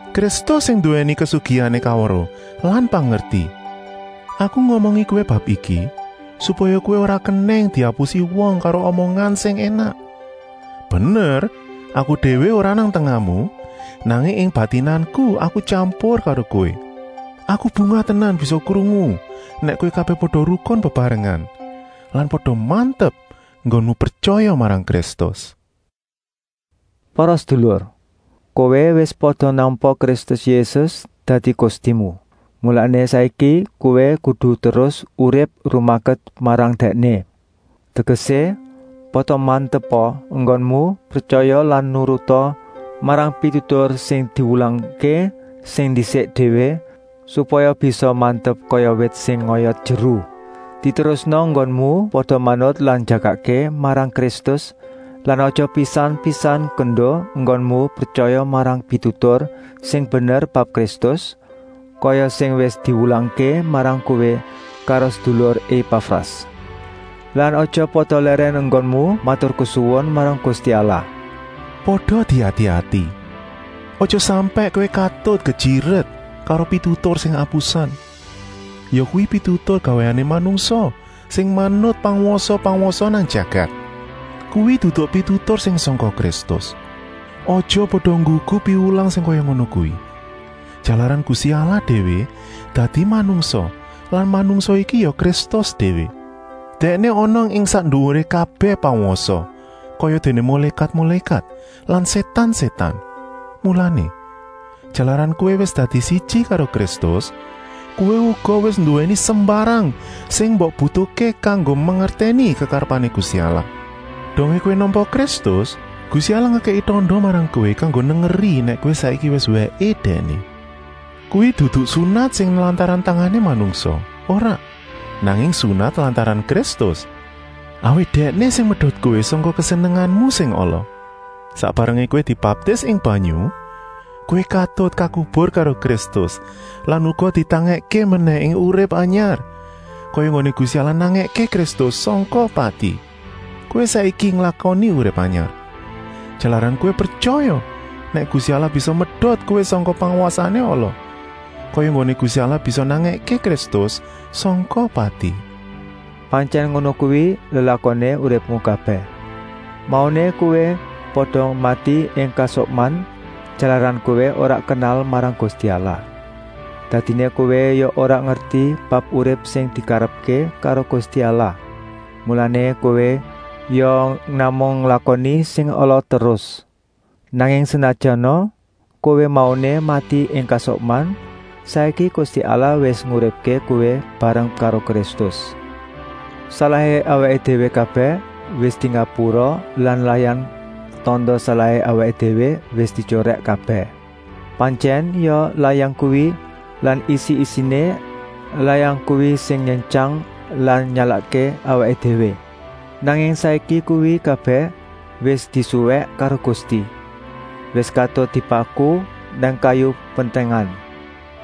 Kristus sing nduwèni kasugihané kaweruh lan pangerti. Aku ngomongi kowé bab iki, supaya kowé ora kenèng diapusi wong karo omongan sing énak. Bener, aku déwé ora nang tengahmu, nanging ing batinanku aku tyampur karo kowé. Aku bungah tenan bisa krungu nèk kowé kabèh pada rukun bebarengan lan pada mantep enggonmu pretyaya marang Kristus. Para sedulur, kowé wis pada nampa Kristus Yésus dadi Gustimu, mulané saiki kowé kudu terus urip rumaket marang Dèkné. Tegesé, pada mantepa enggonmu pretyaya lan nuruta marang pitutur sing diwulangké sing ndisik déwé, supaya bisa mantep kaya wit sing ngoyot jeru. Diterusna enggonmu pada manut lan njagakké marang Kristus lan aja pisan-pisan kendo enggonmu pretyaya marang pitutur sing bener bab Kristus, kaya sing wis diwulangké marang kowé karo sedulur Epafras. Lan aja pada lèrèn enggonmu maturkesuwun marang Gusti Allah. Pada diati-ati, aja sampèk kowé katut kejiret karo pitutur sing apusan, yakuwi pitutur gawéané manungsa sing manut pangwasa-pangwasa nang jagat. Kuwi dudu pitutur sing sangka Kristus. Aja pada nggugu piwulang sing kaya ngono kuwi, jalaran Gusti Allah déwé dadi manungsa lan manungsa iki ya Kristus déwé. Dèkné ana ing sak nduwuré kabèh pangwasa, kayadéné mulékat-mulékat lan sétan-sétan. Mulané, jalaran kowé wis dadi siji karo Kristus, kowé uga wis nduwèni sembarang sing mbok butuhké kanggo mangertèni kekarepané Gusti Allah. Dongé kowé nampa Kristus, Gusti Allah ngekèki tanda marang kowé kanggo nengeri nèk kowé saiki wis wèké Dèkné. Kuwi dudu sunat sing lantaran tangané manungsa, ora, nanging sunat lantaran Kristus, awit Dèkné sing medot kowé sangka kesenenganmu sing ala. Sak barengé kowé dibaptis ing banyu, kowé katut kakubur karo Kristus lan uga ditangèkké menèh ing urip anyar, kaya enggoné Gusti Allah nangèké Kristus sangka pati. Kowé saiki nglakoni urip anyar, jalaran kowé pretyaya nèk Gusti Allah bisa medot kowé sangka pangwasané ala, kaya enggoné Gusti Allah bisa nangèké Kristus sangka pati. Pantyèn ngono kuwi lelakoné uripmu kabèh. Mauné kowé pada mati ing kasukman, jalaran kowé ora kenal marang Gusti Allah. Dadiné kowé ya ora ngerti bab urip sing dikarepké karo Gusti Allah. Mulané kowé ya namung nglakoni sing ala terus. Nanging senajana kowé mauné mati ing kasukman, saiki Gusti Allah wis nguripké kowé bareng karo Kristus. Salahé awaké déwé kabèh wis dingapura lan layang tanda salahé awaké déwé wis dityorèk kabèh. Pantyèn ya layang kuwi lan isi-isiné layang kuwi sing nyentyang lan nyalahké awaké déwé. Nanging saiki kuwi kabèh wis disuwèk karo Gusti, wis katut dipaku nang kayu pentèngan.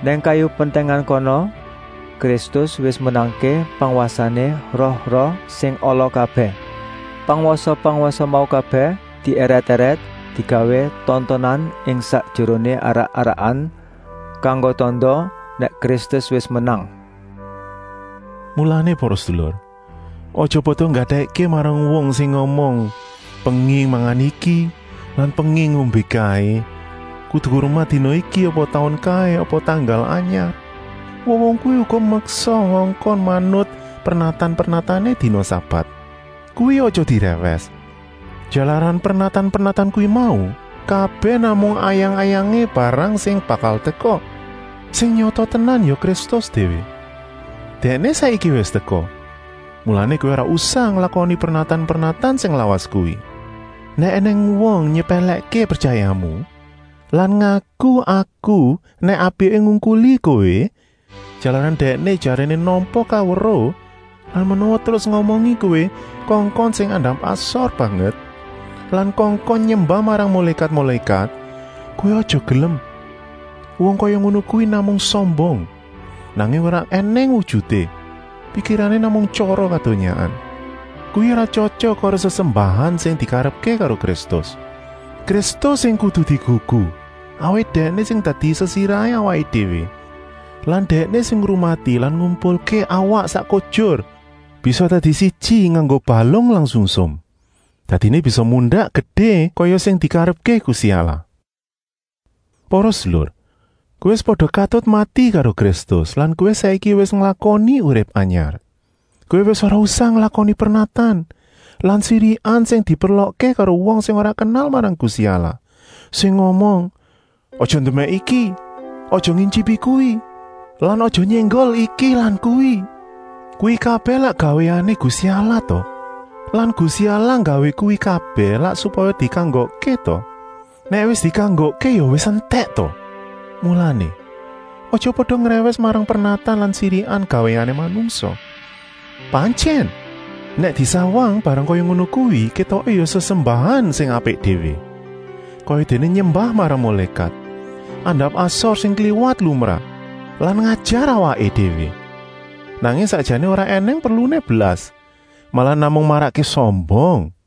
Nang kayu pentèngan kono Kristus wis menangké pangwasané roh-roh sing ala kabèh. Pangwasa-pangwasa mau kabèh dièrèt-èrèt digawé tontonan ing sakjeroné arak-arakan, kanggo tanda nèk Kristus wis menang. Mulané para sedulur, aja pada nggatèkké marang wong sing ngomong penging mangan iki lan penging ngombé kaé, kudu ngurmat dina iki apa taun kaé apa tanggal anyar. Wong-wong kuwi uga meksa ngongkon manut pernatan-pernatané dina sabat. Kuwi aja dirèwès, jalaran pernatan-pernatan kuwi mau kabèh namung ayang-ayangé barang sing bakal teka. Sing nyata tenan ya Kristus déwé. Dèkné saiki wis teka, mulané kowé ora usah nglakoni pernatan-pernatan sing lawas kuwi. Nèk ènèng wong nyepèlèkké pretyayamu lan ngaku-aku nèk apiké ngungkuli kowé, jalaran dèkné jaréné nampa kaweruh lan menawa terus ngomongi kowé kongkon sing andap-asor banget lan kongkon nyembah marang mulékat-mulékat, kowé aja gelem. Wong kaya ngono kuwi namung sombong, nanging ora ènèng wujuté, pikirané namung tyara kadonyaan. Kuwi ora tyotyok karo sesembahan sing dikarepké karo Kristus. Kristus sing kudu digugu, awit Dèkné sing dadi sesirahé awaké déwé lan Dèkné sing ngrumati lan ngumpulké awak sak kujur bisa dadi siji nganggo balung lan sungsum. Dadiné bisa mundak gedé kaya sing dikarepké Gusti Allah. Para sedulur, kowé wis pada katut mati karo Kristus lan kowé saiki wis nglakoni urip anyar. Kowé wis ora usah nglakoni pernatan lan sirikan sing diperlokké karo wong sing ora kenal marang Gusti Allah, sing ngomong: “Aja ndemèk iki,” “Aja ngityipi kuwi,” lan “Aja nyénggol iki lan kuwi!” Kuwi kabèh lak gawéané Gusti Allah ta? Lan Gusti Allah nggawé kuwi kabèh lak supaya dikanggokké ta? Nèk wis dikanggokké ya wis entèk ta? Mulané, aja pada ngrèwès marang pernatan lan sirikan gawéané manungsa. Pantyèn, nèk disawang barang kaya ngono kuwi kétoké ya sesembahan sing apik déwé, kayadéné nyembah marang mulékat, andap-asor sing kliwat lumrah lan ngajar awaké déwé. Nanging sakjané ora ènèng perluné blas, malah namung marakké sombong.